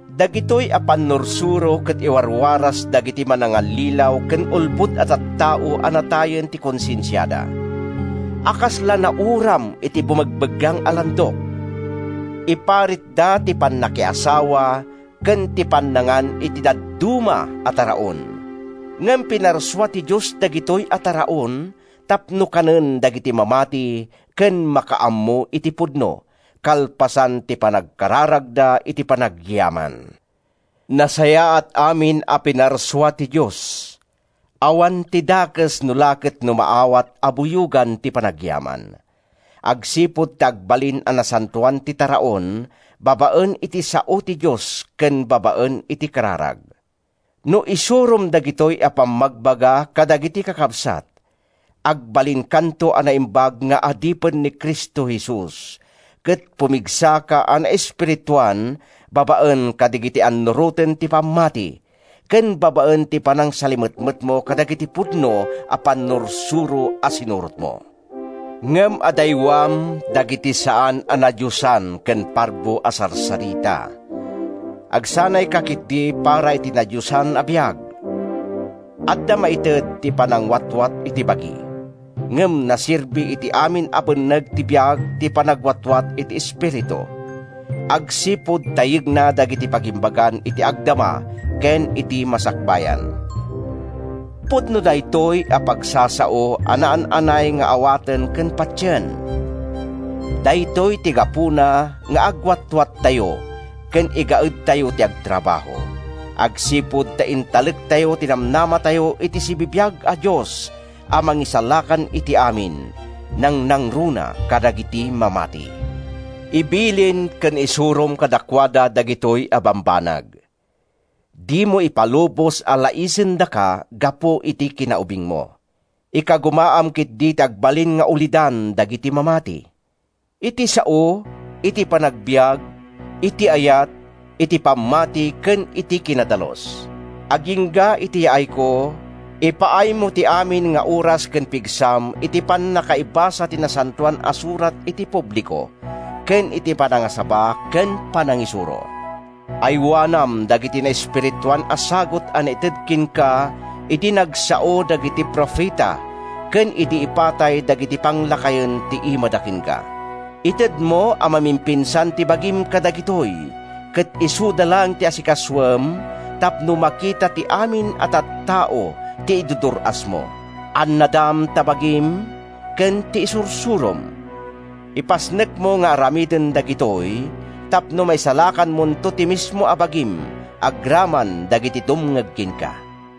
Dagitoy a pannursuro ket iwarwaras dagiti manangallilaw ken ulbod a tattao a natayen ti konsensiada, a kasla nauram iti bumegbeggang a landok. Iparitda ti pannakiasawa ken ti pannangan iti dadduma a taraon. Ngem pinarsua ti Dios dagitoy a taraon tapno kanen dagiti mamati ken makaammo iti pudno, kalpasan ti panagkararagda iti panagyaman. Nasayaat amin a pinarsua ti Dios. Awan ti dakes no la ket no maawat a buyogan ti panagyaman, agsipud ta agbalin a nasantoan ti taraon babaen iti sao ti Dios ken babaen iti kararag. No isurom dagitoy a pammagbaga kadagiti kakabsat, agbalinkanto a naimbag nga adipen ni Cristo Jesus, ket pumigsaka a naespirituan babaen kadagiti annuroten ti pammati ken babaen iti panangsalimetmetmo kadagiti pudno a pannursuro a sinurotmo. Ngem adaywam dagiti saan a nadiosan ken parbo a sarsarita. Agsanayka ketdi para iti nadiosan a biag. Adda maited ti panangwatwat iti bagi, ngem naserbi iti amin a benneg ti biag ti panagwatwat iti espiritu, agsipud ta yegna dagiti pagimbagan iti agdama ken iti masakbayan. Pudno daytoy a pagsasao a naan-anay nga awaten ken patien. Daytoy ti gapuna nga agagawatayo ken igaedtayo ti agtrabaho, agsipud ta intalektayo ti namnamatayo iti sibibiag a Dios a Mangisalakan iti amin, nangnangruna kadagiti mamati. Ibilin ken isurom kadakuada dagitoy a bambanag. Dimo ipalubos a laisendaka gapu iti kinaubingmo. Ikagumaam ketdi ti agbalin nga ulidan dagiti mamati: iti sao, iti panagbiag, iti ayat, iti pammati ken iti kinadalus. Agingga iti yaayko, ipaaymo ti amin nga oras ken pigsam iti pannakaibasa ti Nasantoan a Surat iti publiko, ken iti panangasaba ken panangisuro. Aywanam dagiti naespirituan a sagut a naited kenka idi nagsao dagiti profeta ken idi ipatay dagiti panglakayen ti imada kenka. Itedmo a mamimpinsan ti bagim kadagitoy ket isuda laeng ti asikasoem tapno makita ti amin a tattao ti idurdur-asmo. Annadam ta bagim ken ti isursurom. Ipasnekmo nga aramiden dagitoy tapno maisalakanmonto ti mismo a bagim agraman dagiti dumngeg kenka.